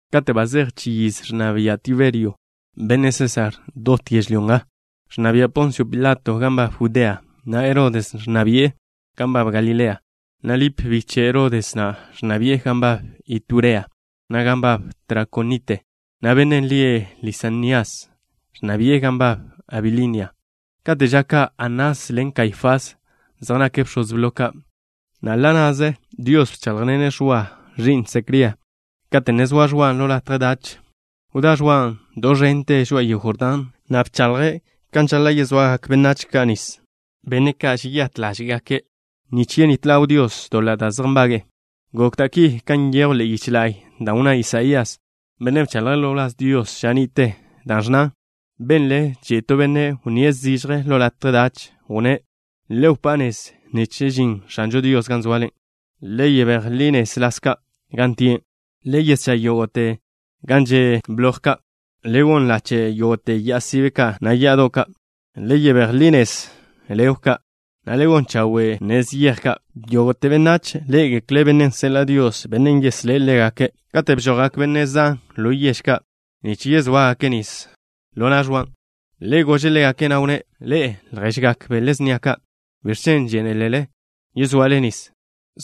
Kate' ba zej chi yiz ẕnna bia' Tiberio, benne' Sésar, dot yežlyó nga, ẕnna bia' Ponsio Pilato gan nbab Judea, na' Herodes ẕnna bi'e gan nbab Galilea, na' Lip, biche' Herodes na', ẕnna bi'e gan nbab Iturea, na' gan nbab Trakonite, na' bennen' lie' Lisanias ẕnna bi'e gan nbab Abilinia. Kate' ža ka' Anás ḻen Kaifás, zej nake' bx̱oz blo ka', na' ḻa' na'ze Dios bcháḻjḻene' Ẕwa, ẕi'n Secría, kate' ne zoa Ẕwan' ḻo latje dach. Wdá Ẕwan' do ẕente žoa'a yego Jordán, na' bchaḻje' kan žaḻa' yezoagak benách ka' nis, benne' ka' žeyát ḻáže'gake' nich yenít ḻaw Dios doḻa' da' zej nbage'e. Gok da' ki kan nyejw ḻe'e yich la'y, dan' wnná Isaías, benne' bchaḻje' ḻo wláz Dios ža ni'te, dan' ẕnnan: Benle chi'i to benne' wnníe' zižje ḻo latje dach, wnné': “Le wpá' nez nich žin X̱anžo Dios gan zoale. Le yebéj li nez las ka' gan tie'. Le yeschá' yógo'te gan zej že' bloj ka'. Le gon lache' yógo'te ya'a sibe ka', na' ya'ado' ka'. Le yebéj ḻi nez legw ka', na' le gon chawe' nez yej ka'. Yógo'te benách ḻé'egekle' bennen' seḻa' Dios, bennen' yeslé' ḻégake'.” Kate' bžojgak benne' zan ḻo yež ka' nich yezóagake' nis ḻo na' Ẕwan', ḻe' gože' ḻégake', na' wnné': —Ḻe'e, lježgak bele snia ka'. ¿Biẕ chen' žénelele yezoale nis?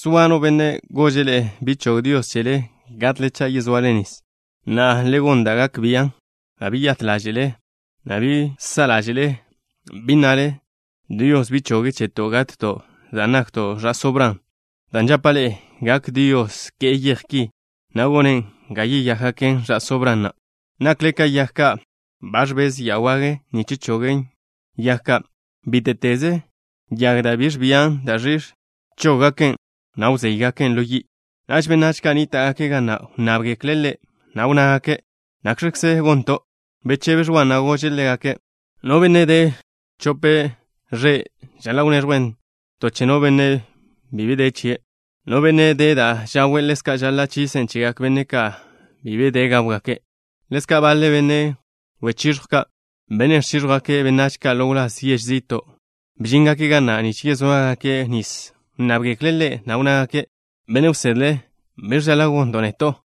¿Zoa no benne' gože' ḻe'e bi chog Dios chele gatle cha' yezoale nis? Na'a, le gon da' gak bian' ba beyát ḻáže'le, na' bi sa' ḻáže'le, bi nnale: “Dios bi choge' cheto' gatto' dan' nakto' ẕa'só Bran” dan' žapa' ḻe'e, gak Dios ke'e yej ki, na' gone' ga yeyákgaken ẕa'só Bran na'. Nakle ka yag ka'. Ba ẕbez ya wage nich chogen yag ka'. Bíte'teze yag da' bi ẕbian da' ẕix̱ chen, chóggaken', na' wzéygaken' ḻo yi'. Naž benách ka' nníta'gake' ga na' wnnábgekle' ḻe', na' wnnágake': —¿Nakx̱kze gonto'? Bechebe Ẕwan', na' gože' ḻégake': —No benne' de chope ẕe' žaḻa' wneẕjwe' ton che no benne' bi de chie'. No benne' de da' žawe', ḻezka' žaḻa' chisen' chegak benne' ka' bi de da' gáwgake'. Ḻezka' baḻe benne' wechiẕjw ka', benne' ẕchíẕjwgake' benách ka' ḻo wláz yež zi'to', bžíngake' ga na' nich yezóagake' nis. Wnnábgekle' ḻe', na' wnnágake': —Benne' wsedle, ¿biẕ žaḻa' gonto' neto'?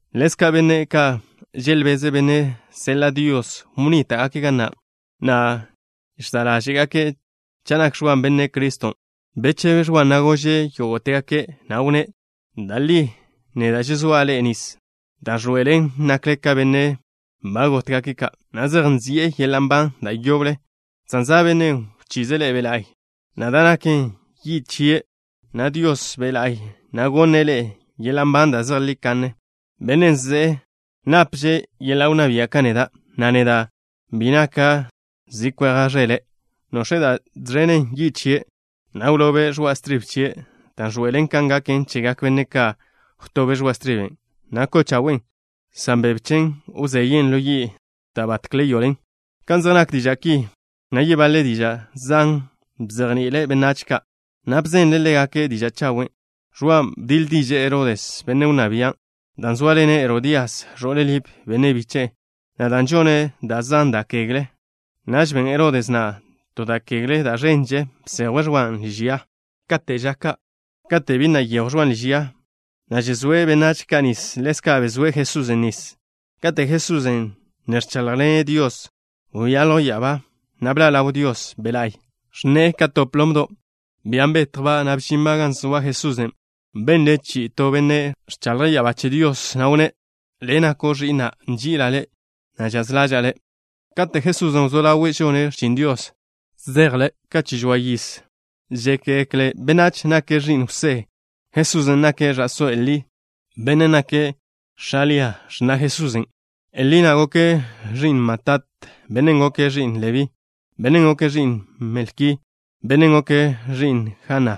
Ḻezka' benne' ka' želbeze' Bennen' seḻa' Dios, wnníta'gake' ga na', na' žsa' ḻáže'gake' cha' nak Ẕwan' Benne' Criston'. Bechebe Ẕwan', na' gože' yógo'tegake', na' wnné': —Da' li neda' žezóa' ḻe'e nis, da' ẕḻoe'elen nakle ka benne' ka' ba gótgake', na' zej nzi'e yeḻa' nban da' yoble, san za' Bennen' wchize' ḻe'e Dios Be' La'y, na' da' naken yi' chie', na' Dios Be' La'y na' gonne' ḻe'e yeḻa' nban da' zejlí kanne. Bennen' ze'e napže' yeḻa' wnná bia' ka neda', na' neda' bi naka' zi kweja' ẕele'. Nox̱e' da' žẕen yi' chie', na' wlobe' ẕoa' stribe chie', dan' ẕḻoe'elen kan gaken chegak benách ka'. Wtobe' ẕoa' striben', na' ko'o chawen', san bebe chen wzeyen' ḻo yi' da' batkle yoḻen. Kan zej nak diža' ki, na' yebaḻe diža' zan bzejni'ile' benách ka', na' bzenle' ḻégake' diža' chawen'. Ẕwan' bdiḻ diže'e Herodes, benne' wnná bia', dan' zóaḻene' Herodías, ẕo'le Lip, benne' biche'e, na' dan' žone' da' zan da' kegle. Naž ben Herodes na' to da' kegle da' ẕenže, bsejwe' Ẕwan' liž ya. Kate' ža ka' kate' bi na' nyejw Ẕwan' liž ya, na' žezóe' benách ka' nis, ḻezka' bezóe' Jesusen' nis. Kate' Jesusen' ne ẕcháḻjḻene' Dios, wyaljw ya'abá, na' bḻa' ḻaw Dios Be' La'y. Ẕnne'e ka to plomdo', bian' betjba', na' bžinba' gan zoa Jesusen'. Benle' chi'i to Benne' ẕchaḻje' ya'abá che Dios, na' wnné': —Le' nako' Ẕi'na'. Nži'ila' Le', na' žaz ḻaža'a Le'. Katen' Jesusen' wzó ḻawe' žone' x̱chin Dios, zeje' Ḻe' ka chi žoa yiz. Žékgekle benách nake' ẕi'n Jwsé. Jesusen' nake' ẕa'só Elí. Bennen' nake' x̱a Lia, x̱na' Jesusen'. Elí na' goke' ẕi'n Matat. Bennen' goke' ẕi'n Lebí. Bennen' goke' ẕi'n Melki. Bennen' goke' ẕi'n Jana.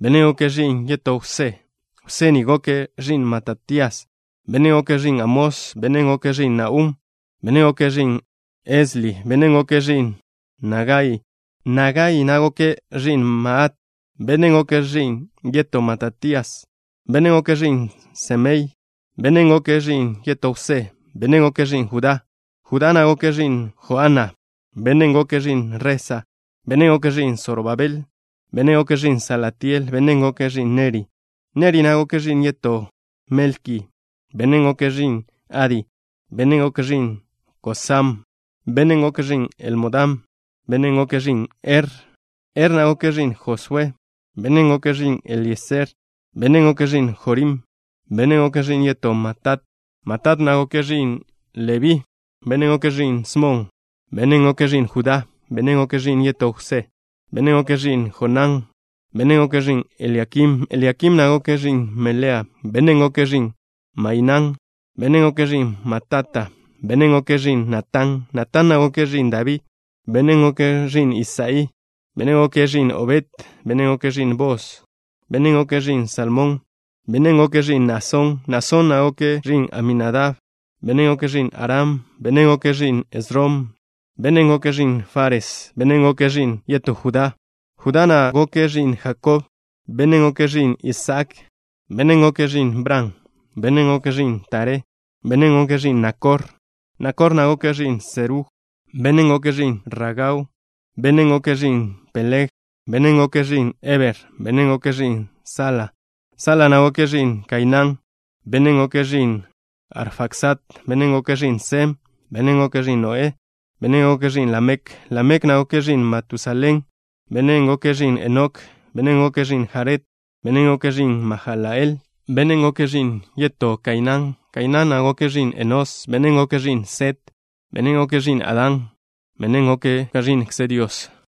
Bennen' goke' ẕi'n yetó Jwsé. Jwsé ni goke' ẕi'n Matatías. Bennen' goke' ẕi'n Amós. Bennen' goke' ẕi'n Nahum. Bennen' goke' ẕi'n Esli. Bennen' goke' ẕi'n Nagai. Nagai na' goke' ẕi'n Maat. Bennen' goke' ẕi'n yetó Matatías. Bennen' goke' ẕi'n Semei. Bennen' goke' ẕi'n yetó Jwsé. Bennen' goke' ẕi'n Judá. Judá na' goke' ẕi'n Joana. Bennen' goke' ẕi'n Resa. Bennen' goke' ẕi'n Sorobabel. Bennen' goke' ẕi'n Salatiel. Bennen' goke' ẕi'n Neri. Neri na' goke' ẕi'n yetó Melki. Bennen' goke' ẕi'n Adi. Bennen' goke' ẕi'n Kosam. Bennen' goke' ẕi'n Elmodam. Bennen' goke' ẕi'n Er. Er na' goke' ẕi'n Josué. Bennen' goke' ẕi'n Elieser. Bennen' goke' ẕi'n Jorim. Bennen' goke' ẕi'n yetó Matat. Matat na' goke' ẕi'n Lebí. Bennen' goke' ẕi'n Smon. Bennen' goke' ẕi'n Judá. Bennen' goke' ẕi'n yetó Jwsé. Bennen' goke' ẕi'n Jonán. Bennen' goke' ẕi'n Eliakim. Eliakim na' goke' ẕi'n Melea. Bennen' goke' ẕi'n Mainán. Bennen' goke' ẕi'n Matata. Bennen' goke' ẕi'n Natán. Natán na' goke' ẕi'n Dabí. Bennen' goke' ẕi'n Isaí. Bennen' goke' ẕi'n Obed. Bennen' goke' ẕi'n Boos. Bennen' goke' ẕi'n Salmón. Bennen' goke' ẕi'n Naasón. Naasón na' goke' ẕi'n Aminadab. Bennen' goke' ẕi'n Aram. Bennen' goke' ẕi'n Esrom. Bennen' goke' ẕi'n Fares. Bennen' goke' ẕi'n yetó Judá. Judá na' goke' ẕi'n Jakob. Bennen' goke' ẕi'n Isaak. Bennen' goke' ẕi'n Bran. Bennen' goke' ẕi'n Taré. Bennen' goke' ẕi'n Nakor. Nakor na' goke' ẕi'n Serug. Bennen' goke' ẕi'n Ragau. Bennen' goke' ẕi'n Peleg. Bennen' goke' ẕi'n Heber. Bennen' goke' ẕi'n Sala. Sala na' goke' ẕi'n Kainán. Bennen' goke' ẕi'n Arfaxad. Bennen' goke' ẕi'n Sem. Bennen' goke' ẕi'n Noé. Bennen' goke' ẕi'n Lamek. Lamek na' goke' ẕi'n Matusalén. Bennen' goke' ẕi'n Enok. Bennen' goke' ẕi'n Jared. Bennen' goke' ẕi'n Mahalalel. Bennen' goke' ẕi'n yetó Kainán. Kainán na' goke' ẕi'n Enós. Bennen' goke' ẕi'n Set. Bennen' goke' ẕi'n Adán. Bennen' goke' ka ẕi'nkze Dios.